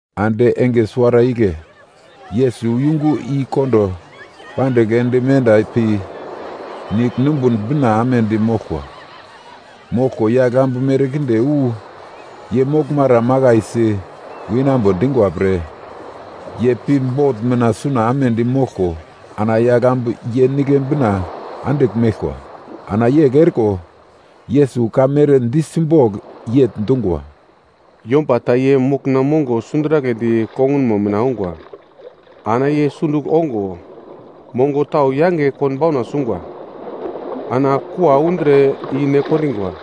Ande enge suwara igle, Yesus yungu i kondo pandigl ende menda pi, nigl numbun bina amedi moglkwa. Moglko yagl ambu merkinde wu ye moglmara makaisi winambo dingwa pre, ye pi bot mina suna amedi moglko, ana yagl ambu ye nigle bina andigl meglkwa. Ana yegl eriko, Yesus ka mere di simbogl yegl dungwa, “Yomba ta ye mokna mongo sunduraglendi kongunmo mina ongwa. Ana ye sundugl ongo, mongo tau yange konbauna sungwa, ana kua undre i ne kondingwa.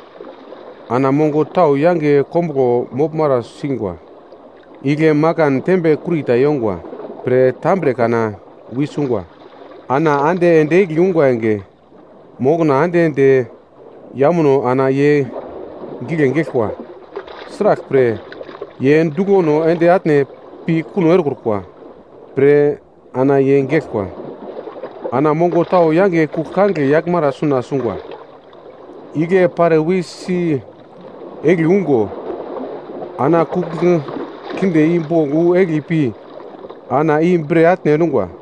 Ana mongo tau yange kombuglo moglmara singwa, igle makan tembe kurita yongwa pre tambre kana wisungwa. Ana ande ende egli ungwa enge, mokna ande de yamuno ana ye gigle geglkwa, sraglpre ye duglono ende atne pi kuno erekrukwa pre ana ye geglkwa. Ana mongo tau yange kugl kangigle yaglmara suna sungwa. Igle pare wisi egli ungo, ana kugl kinde i bogl wu egli pi, ana i bre atne endungwa.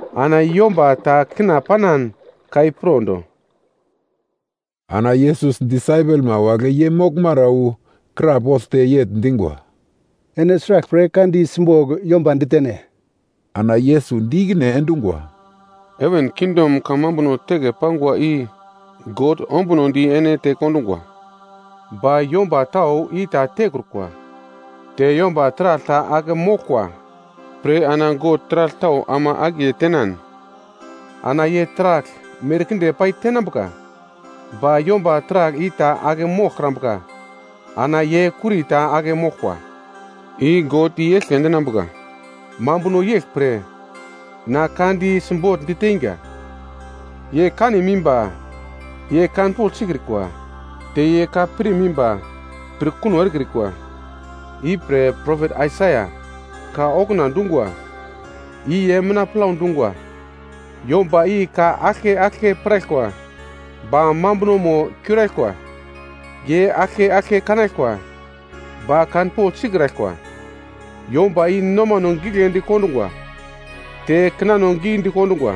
Ana yomba ta kina panan, ka i pro do.” Ana Yesus disaipelma wagle ye moglmara wu krapoglte yegl dingwa, “Ene sraglpre ka di simbogl yomba ditene?” Ana Yesus di ikine endungwa, “Heven kingdom kamambuno teke pangwa i God ombunodi ene tekondungwa. Ba yomba tau i ta tekrukwa. Te yomba taragl ta ake moglkwa pre ana God taragl tau ama akiye tenan, ana ye taragl merkinde pai tenambuka. Ba yomba taragl i ta ake moglkrambuka, ana ye kurita ake moglkwa, i God i-eglke endinambuka. Mambuno yeglpre na ka di simbogl diteinga: “Ye kanim imba, ye kanpogl sikrikwa, te ye ka pirm imba, pir kuno erekrikwa. I pre propet Aisaia ka okuna dungwa, i ye mina plau dungwa: “‘Yomba i ka aglke aglke piraglkwa, ba mambunomo kiuraglkwa, ye aglke aglke kanaglkwa, ba kanpogl sikraglkwa. Yomba i nomano giglendi kondungwa, te kinano gidi kondungwa,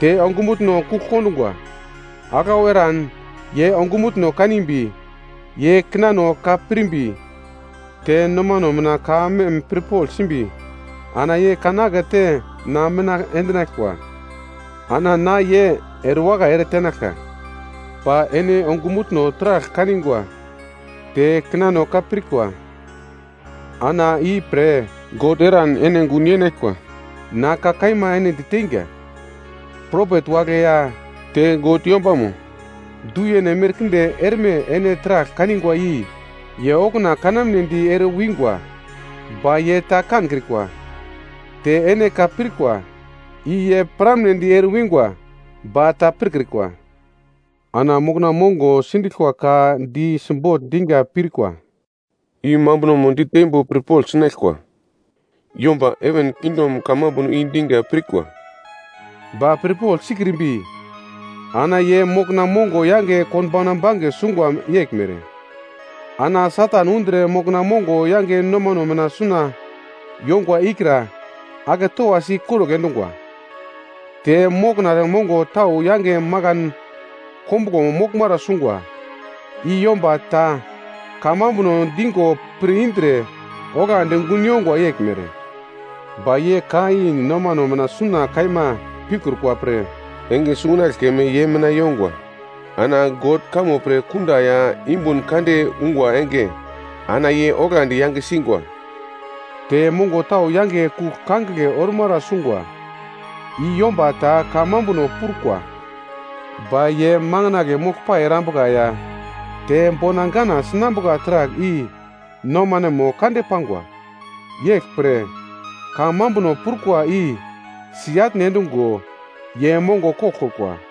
te ongumutno kugl kondungwa. Aglau eran ye ongumutno kanimbi, ye kinano ka pirmbi, te nomano mina ka mem pirpogl simbi, ana ye kan akete na mina endinaglkwa, ana na ye erewakai ere tenaglka.’ Ba ene ongumutno taragl kanigwa, te kinano ka pirkwa, ana i pre God eran ene gun yenaglkwa. Na ka kaima ene diteinga, propet wagle ya te God yombamo du-yene merkinde erme ene taragl kanigwa i ye okuna kanamnedi ere wingwa, ba ye ta kankrikwa. Te ene ka pirkwa, i ye piramnedi ere wingwa ba ta pirkrikwa. “Ana mokna mongo sindiglkwa ka di simbogl diga pirkura i mambunomo diteimbo pirpogl sinaglkwa. Yomba heven kingdom kamambuno i diga pirkwa, ba pirpogl sikrimbi ana ye mokna mongo yange konbauna bange sungwa yeglmere. Ana Satan undre mokna mongo yange nomano mina suna yongwa ikra ake towasi ikorugl endungwa. Te mokna mongo tau yange makan kombuglo moglmara sungwa, i yomba ta kamambuno digo pir indre oglandi gun yongwa yeglmere. Ba ye ka i nomano mina suna kaima pikrukwa pre, enge sungunagle keme ye mina yongwa. Ana God kamo pre kunda ya yumbun kande ungwa enge ana ye oglandi yange singwa. Te mongo tau yange kugl kangigle ormara sungwa, i yomba ta kamambuno prukwa, ba ye manginagle moglpai erambuka ya te bona gana sinambuka taragl i nomanemo kande pangwa, yeglpre kamambuno prukwa i si-atne endungo ye mongo koglkrukwa.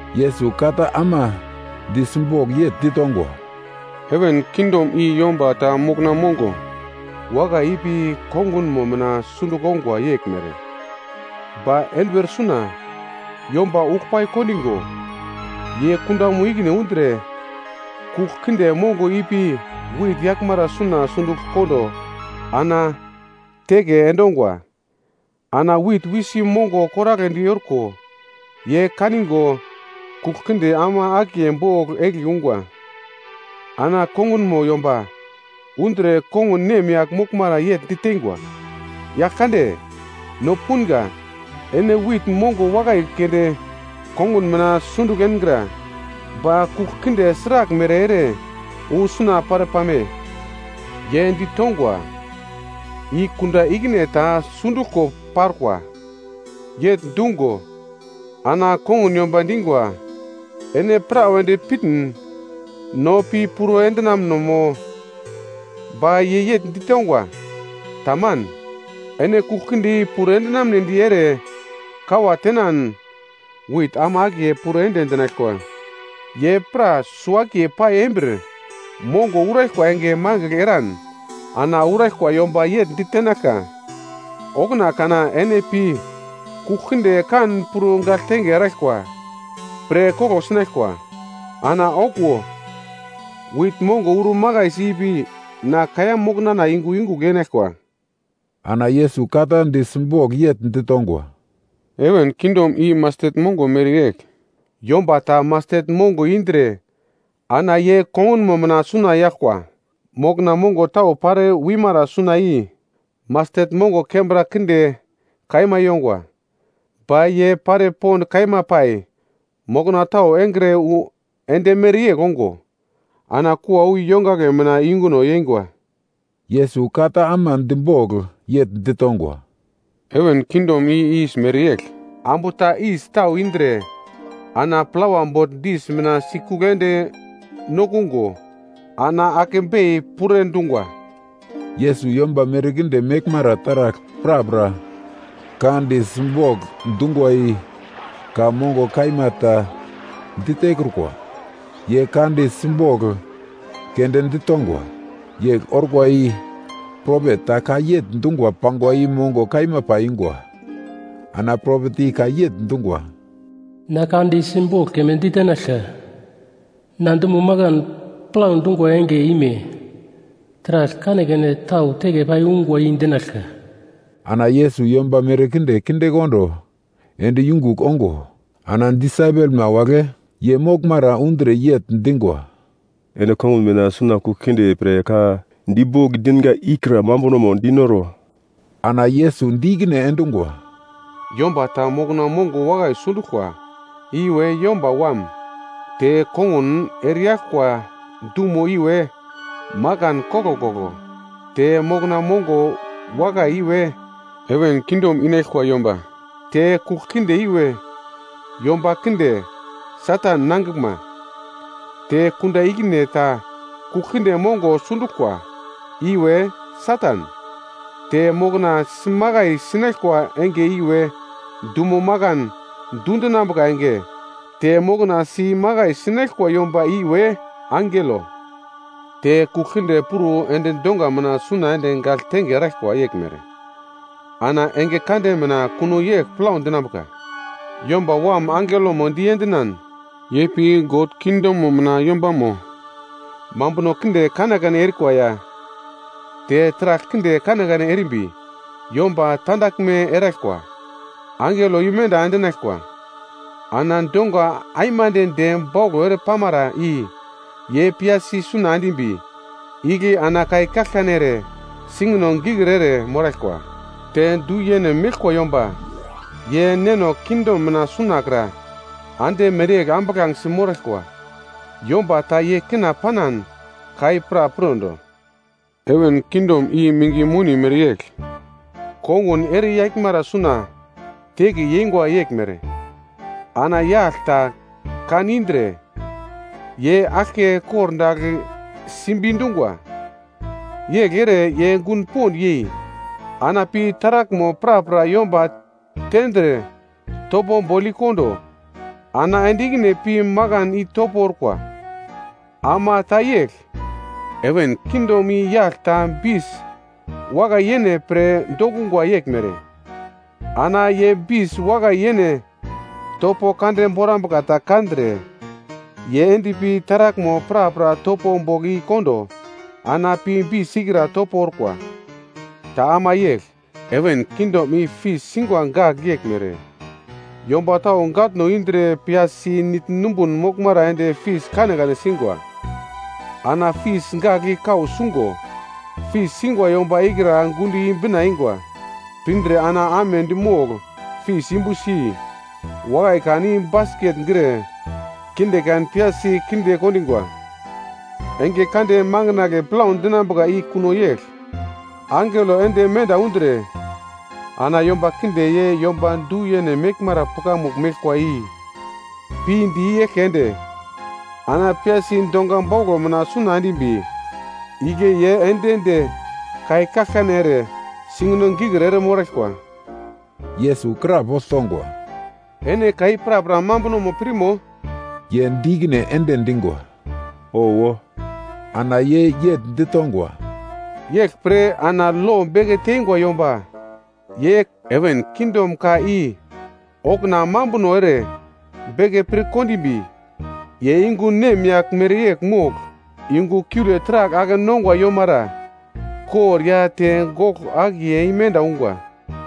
Yesus ka ta ama di simbogl yegl ditongwa, “Heven kingdom i yomba ta mokna mongo wakai ipi kongunmo mina sundugl ongwa yeglmere. Ba enduwer suna yomba uglpai kondigo, ye kundamo ikine undre, kugl kinde mongo ipi wit yaglmara suna sundugl kondo ana teke endongwa. Ana wit wisi mongo koragledi orko, ye kanigo kugl kinde ama akiye bogl egli ungwa. “Ana kongunmo yomba undre kongun nemyagl moglmara yegl diteingwa, ‘Yagl kande, no punga ene wit mongo wakai keunde kongun mina sundugl engra. Ba kugl kinde sraglmere ere wu suna pare pame?’ “Ye ditongwa, ‘I kunda ikine ta sunduglko parkwa.’ “Yegl dungo ana kongun yomba dingwa, ‘Ene prawedi pirmin no pi puro endinamno mo?’ “Ba ye yegl ditongwa, ‘Taman, ene kugl kinde i puro endinamnedi ere kawa tenan wit ama akiye puro ende dinaglkwa. Ye pra suwo-akiye pai embir mongo uraglkwa enge mangigl eran ana uraglkwa yomba yegl ditenaglka. Okuna kana ene pi kugl kinde kan puro gagltenge eraglkwa pre koglo sinaglkwa. Ana okuwo wit mongo uro makaisi ipi na kaiya moknana yungu yungugl yenaglkwa.’” Ana Yesus ka ta di simbogl yegl ditongwa, “Heven kingdom i mastet mongo mereyegl, yomba ta mastet mongo indre ana ye kongunmo mina suna yaglkwa. Mokna mongo tau pare wimara suna i mastet mongo kembra kinde kaima yongwa, ba ye pare pond kaima pai mokna tau engre wu ende mereyegl ongo, ana kua wu yongagle mina yunguno yeingwa.” Yesus ka ta ama dibogl yegl ditongwa, “Heven kingdom i yis mereyegl. Ambu ta yis tau indre ana plawa bogl dis mina sikugl ende nokungo ana ake bei puro dungwa.” Yesus yomba merkinde meglmara taragl prapra ka di simbogl dungwa i ka mongo kaima ta ditekrukwa. Ye ka di simbogl keunde ditongwa. Yegl orkwa i propet ta ka yegl dungo pangwa i mongo kaima paiyungwa. Ana propet i ka yegl dungwa: “Na ka di simbogl keme ditenaglka, na dumo makan plau dungwa enge ime taragl kanekane tau teke pai ungwa i dinaglka.” Ana Yesus yomba merkinde kindekondo ende yungugl ongo, ana disaipelma wagle ye moglmara undre yegl dingwa, “Ene kongun mina suna kugl kinde pre ka dibogl dinga ikra mambunomo dinoro.” Ana Yesus di ikine endungwa, “Yomba ta mokna mongo wakai sunduglkwa, iwe Yomba Wam. Te kongun ereyaglkwa dumo iwe makan koglkoglo. Te mokna mongo wakai iwe heven kingdom inaglkwa yomba. Te kugl kinde iwe, yomba kinde Satan nangiglma. Te kunda ikine ta kugl kinde mongo sunduglkwa, iwe Satan. Te mokna simakai sinaglkwa enge iwe, dumo makan dundinambuka enge. Te mokna si imakai sinaglkwa yomba iwe angelo. “Te kugl kinde puro ende donga mina suna ende gagltenge erikwa yeglmere, ana enge kande mina kuno yegl plau dinambuka. Yomba Wam angelomo diendinan, ye pi God kingdomo mina yombamo mambuno kinde kanekane erikwa ya, te taragl kinde kanekane erimbi yomba tandaglme eraglkwa, angelo imenda endinaglkwa. Ana donga aimande de bauglo ere pamara i ye piyasi suna endimbi, igle ana kai kaglkane ere singino gikir ere moraglkwa. Te du-yene meglkwa yomba ye Neno kingdom mina sunakra ande mereyegl ambuglangesi moraglkwa. Yomba ta ye kina panan ka i pra pirondo. “Heven kingdom i minge moni mereyegl kongun ere yaglmara suna teke yeingwa yeglmere. Ana yagl ta kan indre, ye aglke kordagl simbi dungwa. Yegl ere ye gun pond yei, ana pi taraglmo prapra yomba tendre topo bogl i-kondo, ana ende ikine pi makan i topo orkwa. “Ama ta yegl, heven kingdom i yagl ta bis wakai-yene pre dokungwa yeglmere. Ana ye bis wakai-yene topo kande borambuka ta kandre, ye endpi taraglmo prapra topo bogl i-kondo, ana pi bis ikra topo orkwa. “Ta ama yegl, heven kingdom i fis singwa gagl yeglmere, yomba tau gatno indre piyasi nigl numbun moglmara ende fis kanekane singwa. Ana fis gagl i kau sungo fis singwa yomba ikra gundo i-bina eingwa. Pindre ana amedi mogl fis yumbusi, wakai kan i basket gre, kinde kan piyasi kinde kondingwa. Enge kande makandle plau dinambuka i kuno yegl. Angelo ende menda undre, ana yomba kinde ye yomba du-yene meglmara pukamugl meglkwa i pinde i-eglke ende, ana piyasi donga bauglo mina suna endimbi, igle ye ende de kai kaglkane ere singino gikir ere moraglkwa.” Yesus krapogl tongwa, “Ene ka i prapra mambunomo pirmo?” Ye di ikine ende dingwa, “Owo.” Ana ye yegl ditongwa, “Yeglpre ana lo beke teingwa yomba ye heven kingdom ka i okuna mambuno ere beke pir kondimbi, ye yungu nemyagl mereyegl mogl, yungu kiule taragl ake-nongwa yomara kor ya te goglo akiye imenda ungwa.”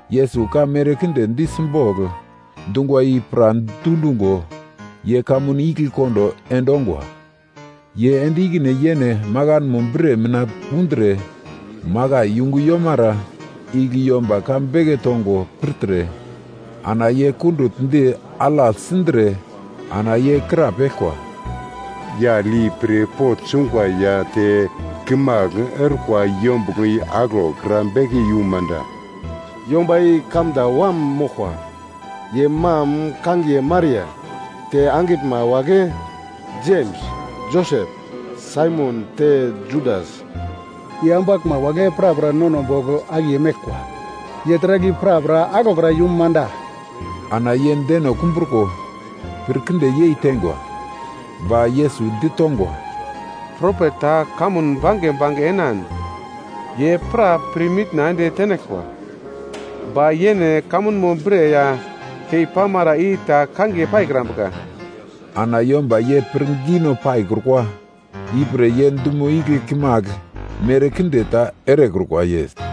Yesus ka merkinde di simbogl dungwa i pra dundungo, ye kamun igle kondo endongwa. Ye ende ikine yene makanmo bre mina undre, makai yungu yomara igle yomba ka beke tongo pirtre, ana ye kundugl di alagl sindre ana ye krapeglkwa, “Yagl i pirpogl sungwa ya te kimagl orkwa yombuglo i aglokra beke yum manda? Yomba i kamda wam moglkwa. Ye mam kangiye Maria, te angiglma wagle, Jems, Josep, Saimon te Judas. Ye ambaglma wagle prapra nono bogl akiye meglkwa. Ye taragl i prapra aglokra yum manda?” Ana ye deno kumbruko pir kinde yei teingwa. Ba Yesus ditongwa, “Propet ta kamun bange bange enan ye pra pirmitna ende tenaglkwa, ba yene kamunmo bre ya kei pamara i ta kangiye paikrambuka.” Ana yomba ye pirngino paikrukwa, ipre ye dumo igle kimagl merkinde ta erekrukwa.